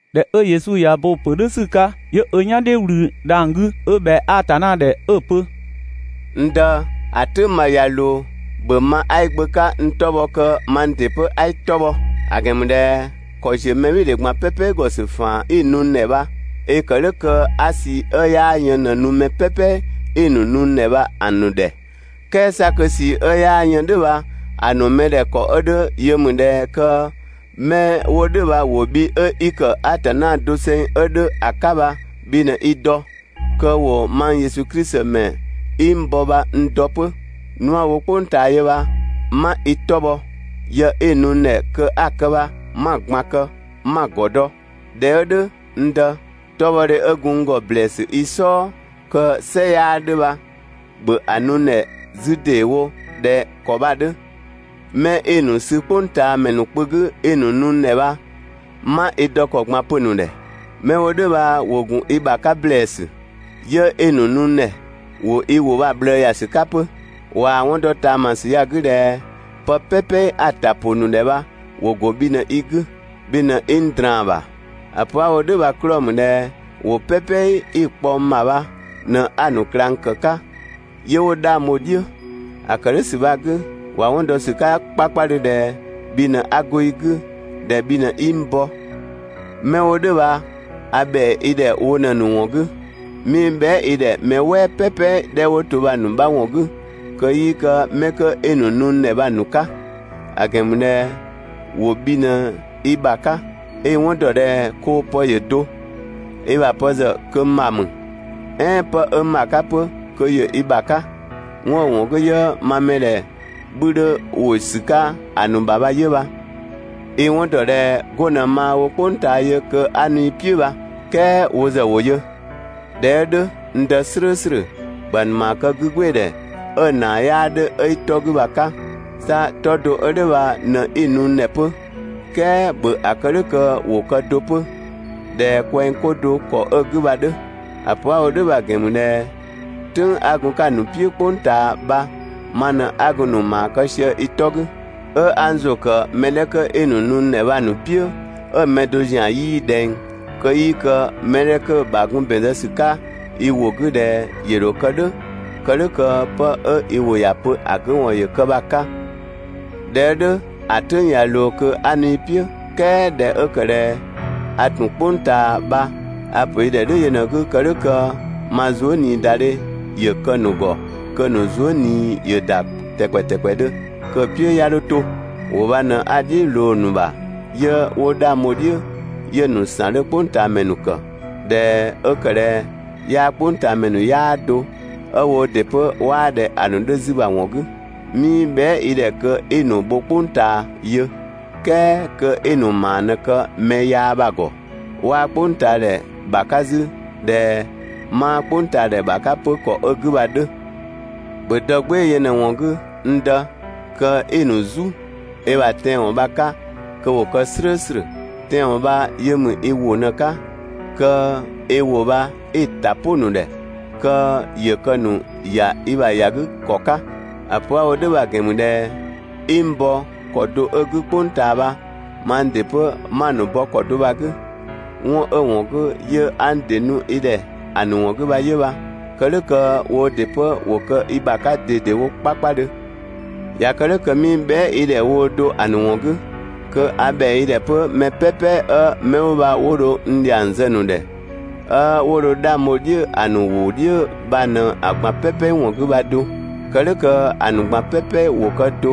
꞊Dhɛ 'ö Yesu ꞊ya ö bo‑ pö "dhʋ̈ ‑sü 'ka, 'yö ö "yan "dhiʋ̈ ꞊wlü dhang‑ 'gü 'ö ꞊bhɛa Atanna ‑dhɛ 'ö‑ pö: «N Dë, ‑a "tʋ̈ng bha ꞊ya ꞊loo, ‑bhö ma 'a i Gbö 'ka bha n 'tɔ bhɔ kö mang ‑dɩ 'pö 'a i 'tɔ bhɔ! ‑A ‑gɛn ‑mü ꞊dhɛ ‑kɔ ‑ziö mɛbhɩɩdhe ꞊gban "pɛpɛ ‑gɔ ‑sü ‑faan 'i‑ nu n ‑dhɛ bha, i‑ ‑kë "dhʋ̈ kö 'a ꞊sii 'ö 'yaa yën ꞊në‑ nu mɛ "pɛpɛ 'i‑ ‑nu nu n ‑dhɛ bha‑ ‑nu ‑dhɛ. "Kɛɛ 'sa kö ꞊sii 'ö 'yaa yën "dhʋ̈ bha‑ ‑nu ‑a ‑nu ‑dhɛ ‑kɔ 'ö 'dhö yö mü ꞊dhɛ kö 'mɛ 'wo "dhʋ̈ bha ‑wo bhi 'ö 'i ‑kë Atanna doseng 'ö 'dhö ‑a 'ka bha bhi ꞊në i dɔ, kö ‑wo mang Yesu Klisi ‑mɛ 'i n bɔ bha n dɔ 'pö. Nu 'a‑ wo "kpʋng ꞊taa yö bha 'ma i 'tɔ bhɔ, yë 'i‑ nu n ‑dhɛ kö 'a‑ kë bha 'ma‑ ꞊gban kë 'ma‑ ‑gɔ dɔ. ꞊Dhɛ 'ö "dhʋ̈, n Dë, 'tɔbhɔdhe 'ö gun n ‑gɔ ‑blɛɛsü i "sɔɔ kö "sɛ 'yaa 'dhö bha, ‑bhö ‑a nu n ‑dhɛ 'zü ‑deewo ꞊dhɛ ‑kɔ bha‑ 'dhö. 'Mɛ 'i‑ ‑nu sü "kpʋngtaamɛ ‑nu kpö 'gü 'i‑ nu n ‑dhɛ bha, 'ma i dɔ ‑kɔ ꞊gban pö‑ ‑nu ‑dhɛ. 'Mɛ 'wo "dhʋ̈ bha ‑wo ‑gun i ‑bha 'ka ‑blɛɛsü, 'yö 'i‑ ‑nu nu n ‑dhɛ, ‑wo i ‑wʋ bha‑ ꞊bhlëë ‑ya ‑sü 'ka 'pö. ꞊Waa‑ 'wɔn dɔ ꞊taamasü ya‑ 'gü ꞊dhɛ pë "pɛpɛ 'a‑ ‑ta ‑pʋ ‑nu ‑dhɛ bha, ‑wo ‑go bhi ꞊në i 'gü, bhi ꞊në 'i n ꞊draan‑ ‑bha. ‑A pö 'a‑ wo "dhʋ̈ bha‑ 'klɔɔ‑ ‑mü ꞊dhɛ ‑wʋ "pɛpɛ 'i‑ kpɔ n ‑bha bha ꞊në 'a‑ ‑nu ꞊klang ‑kë 'ka, 'yö 'wo 'dhang bho‑ "dhiʋ̈. ‑A ‑kë "dhʋ̈ ‑sü bha‑ 'gü, ‑wa 'wɔn dɔ ‑sü 'ka 'kpakpadhö ꞊dhɛ bhi ꞊në 'a go i 'gü, ꞊dhɛ bhi ꞊në 'i n bɔ. 'Mɛ 'wo "dhʋ̈ bha a ‑bhɛa i ‑dhɛ wo ꞊në‑ ‑nu ‑wɔn 'gü. 'Mii bhɛa" i ‑dhɛ mɛ "wɛɛ "pɛpɛ 'dhɛ 'wo to bha‑ ‑nu 'bha ‑wɔn 'gü kö 'yii kë 'mɛ 'kö 'i‑ nu n ‑dhɛ bha‑ ‑nu 'ka; ‑a ‑gɛn ‑mü ꞊dhɛ ‑wo bhi ꞊në i ‑bha 'ka. i‑ 'wɔn dɔ ꞊dhɛ koo‑ pë ‑yö do, i ‑bha pë ‑zë kö n ‑bha ‑mü, "ɛɛn 'pë 'ö n ‑bha 'ka 'pö kö ‑yö i ‑bha 'ka. 'Wɔn 'ö‑ ‑wɔn 'gü 'yö ma mɛdhɛ 'bhü 'dhö ‑wo ‑sü 'ka ‑a ‑nu ‑bha bha 'yö bha. i‑ 'wɔn ‑dɔ ꞊dhɛ 'go ꞊në maa‑ wo "kpʋng ꞊taa yö kö 'a nu i "piʋ̈ bha, "kɛɛ wo ‑zë ‑wo yö. ꞊Dhɛ 'ö "dhʋ̈, n Dë "slʋ̈ʋ̈slʋ̈, ‑bhö ‑a ‑nu ‑maa kë 'gügbɩɩdhɛ 'ö‑ ‑naa 'yaa 'dhö 'ö i 'tɔ 'gü bha‑ 'ka. 'Sa 'tɔ do 'ö "dhʋ̈ bha ꞊në 'i‑ nu n ‑dhɛ 'pö, "kɛɛ ‑bhö ‑a kë "dhʋ̈ kö ‑wo kë do 'pö ꞊dhɛ kwɛng 'ko do ‑kɔ 'ö‑ 'gü bha‑ 'dhö. ‑A pö 'a‑ wo "dhʋ̈ bha‑ ‑gɛn ‑mü ꞊dhɛ "tʋ̈ng 'a gun‑ 'ka‑ ‑nu "piʋ̈ "kpʋng ꞊taa bha, ma ꞊në 'a gun‑ ‑nu ‑maa kë sië i 'tɔ 'gü. 'Ö 'a n ‑zʋ ‑kë mɛ 'dhɛ 'kö 'i‑ n ‑dhɛ bha‑ ‑nu "piʋ̈ 'ö‑ mɛ do ‑zian 'yii ꞊dhɛng, kö 'yii kë mɛ 'dhɛ 'kö‑ ‑bha gun ‑bɛn zë ‑sü 'ka i ‑wʋ 'gü ꞊dhɛ ‑yö ‑dho kë "dhʋ̈, kë "dhʋ̈ kö 'pë 'ö i ‑wʋ ‑ya pö ‑a 'gü ‑wɔn ‑yö kë bha‑ 'ka. ꞊Dhɛ 'ö "dhʋ̈ ‑a "tʋ̈ng ꞊ya ꞊loo kö 'a nu i "piʋ̈, "kɛɛ ꞊dhɛ 'ö ‑kë ꞊dhɛ a ‑tun "kpʋng ꞊taa bha, a‑ ‑pö i ‑dhɛ "dhʋ̈ yö ꞊në‑ 'gü kë "dhʋ̈ kö ma zuëniidadhe ‑yö kë‑ ‑nu ‑gɔ kö‑ ‑nu zuë" ꞊nii ‑yö ‑da ‑tɛkpɛ ‑tɛkpɛdhö, kö‑ "piʋ̈ 'ya 'dho 'to. I ‑wʋ bha ꞊në 'a‑ "dhiʋ̈ ꞊loo‑ ‑nu ‑bha 'yö 'wo 'dhang bho‑ "dhiʋ̈ 'yö‑ ‑nu ‑san 'dhö "kpʋngtaamɛ ‑nu ‑kë, ꞊Dhɛ 'ö ‑kë ꞊dhɛ yaa "kpʋngtaamɛ ‑nu 'yaa do, 'ö woo ‑dɩ 'pö 'waa ꞊dhɛ ‑a ‑nu 'dhö 'zü bha‑ ‑wɔn 'gü. 'Mii bhɛa" i ‑dhɛ kö 'i‑ ‑nu bho "kpʋng ꞊taa yö, "kɛɛ kö 'i‑ ‑nu ‑maa ꞊në‑ kë mɛ yaa bha‑ ‑gɔ. 'Waa "kpʋngtaadhɛ ‑bha 'ka 'zü ꞊dhɛ 'maa "kpʋngtaadhɛ ‑bha 'ka 'pö ‑kɔ 'ö‑ 'gü bha‑ 'dhö. ‑Bhö dɔ "gbɩɩ‑ yö ꞊në‑ ‑wɔn 'gü, n Dë, kö 'i‑ ‑nu "zu i ‑bha tɛanwɔn bha‑ 'ka kö ‑wo kë "slʋ̈ʋ̈slʋ̈. Tɛanwɔn bha yö ‑mü i ‑wʋ ꞊në‑ 'ka, (kö i ‑wʋ bha 'i‑ ‑ta "pʋ‑ ‑nu ‑dhɛ kö ‑yö kë‑ ‑nu ‑ya i ‑bha ‑ya 'gü ‑kɔ 'ka). ‑A pö 'a‑ wo "dhʋ̈ bha‑ ‑gɛn ‑mü ꞊dhɛ 'i n bɔ ‑kɔ do 'ö‑ 'gü "kpʋng ꞊taa bha, mang ‑dɩ 'pö 'ma‑ ‑nu bɔ ‑kɔ do bha‑ 'gü. 'Wɔn 'ö‑ ‑wɔn 'gü 'yö 'a n ‑dɩ nu i ‑dhɛ ‑a ‑nu ‑wɔn 'gü bha 'yö bha, kë "dhʋ̈ kö woo ‑dɩ 'pö ‑wo kë i ‑bha 'ka ꞊dedewo 'kpakpadhö. ꞊Ya kë "dhʋ̈ kö 'mii bhɛa" i ‑dhɛ woo do ‑a ‑nu ‑wɔn 'gü, kö a ‑bhɛa i ‑dhɛ 'pö mɛ "pɛpɛ 'ö 'mɛ 'wo bha 'wo dho n ‑dhiang zë‑ ‑nu ‑dhɛ, 'ö 'wo dho 'dhang bho‑ "dhiʋ̈ ‑a ‑nu ‑wʋ "dhiʋ̈ bha ꞊në‑ ꞊gban "pɛpɛ ‑wɔn 'gü bha do. Kë "dhʋ̈ kö ‑a ‑nu ꞊gban "pɛpɛ ‑wo kë do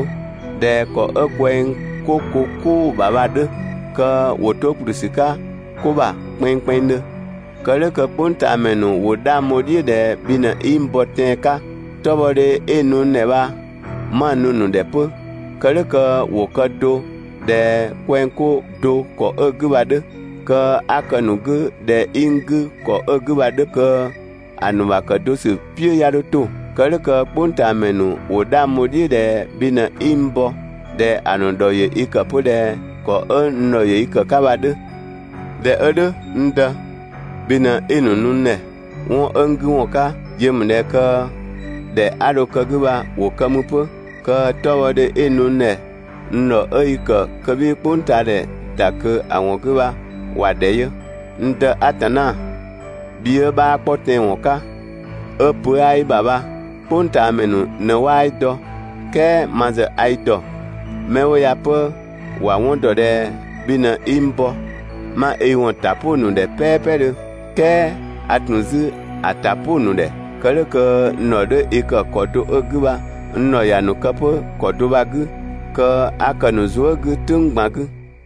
꞊dhɛ ‑kɔ 'ö kwɛng 'ko ko "kʋʋ‑ ‑bha bha‑ 'dhö kö ‑wo 'to ‑kplü ‑sü 'ka ko ‑bha kpɛnngkpɛnngdhö, kë "dhʋ̈ kö "kpʋngtaamɛ ‑nu ‑wo 'dhang bho‑ "dhiʋ̈ ꞊dhɛ bhi ꞊në 'i n bɔ tɛan‑ 'ka. 'Tɔbhɔdhe 'i‑ nu n ‑dhɛ bha 'ma‑ nu‑ ‑nu ‑dhɛ 'pö, kë "dhʋ̈ kö ‑wo kë do ꞊dhɛ kwɛng 'ko do ‑kɔ 'ö‑ 'gü bha‑ 'dhö. Kö 'a kë‑ ‑nu 'gü ꞊dhɛ 'i n 'gü ‑kɔ 'ö 'gü bha‑ 'dhö kö ‑a ‑nu ‑bha kë do ‑sü "piʋ̈ 'ya 'dho 'to. Kë "dhʋ̈ kö "kpʋngtaamɛ ‑nu ‑wo 'dhang bho‑ "dhiʋ̈ ꞊dhɛ bhi ꞊në 'i n bɔ, ꞊dhɛ ‑a ‑nu ‑dhɔ ‑yö i ‑kë 'pö ꞊dhɛ ‑kɔ 'ö n ‑dhɔ ‑yö i kë‑ 'ka bha‑ 'dhö. ꞊Dhɛ 'ö "dhʋ̈, n Dë, bhi ꞊në 'i‑ ‑nu nu n ‑dhɛ. 'Wɔn 'ö n 'gü ‑wɔn 'ka ‑yö ‑mü ꞊dhɛ kö ‑dhɛ 'a dho kë‑ 'gü bha ‑wo kë mü 'pö, kö 'tɔbhɔdhe 'i‑ nu n ‑dhɛ n ‑dhɔ 'ö i ‑kë kö 'bhii "kpʋngtaadhɛ ‑da ꞊kö ‑a ‑wɔn 'gü bha ‑wa ‑dhɛ yö. N Dë Atanna, bhi 'ö 'bhaa 'kpɔ tɛanwɔn 'ka, 'ö pö 'aa i ‑bha bha "kpʋngtaamɛ ‑nu ꞊në 'waa i dɔ, "kɛɛ ma ‑zë a i ‑dɔ, 'mɛ 'wo ya 'pö ‑wa 'wɔn ‑dɔ ꞊dhɛ bhi ꞊në 'i n bɔ. 'Ma i ‑wɔn ‑ta "pʋ‑ ‑nu ‑dhɛ "pɛpɛdhö, "kɛɛ a ‑tun 'zü ‑a ‑ta "pʋ‑ ‑nu ‑dhɛ, kë "dhʋ̈ kö n ‑dhɔ 'dhö i ‑kë ‑kɔ do 'ö‑ 'gü bha n ‑dhɔ ‑ya ‑nu kë 'pö ‑kɔ do bha‑ 'gü, kö 'a kë‑ ‑nu zuë" 'gü "tʋ̈ng ꞊gban 'gü.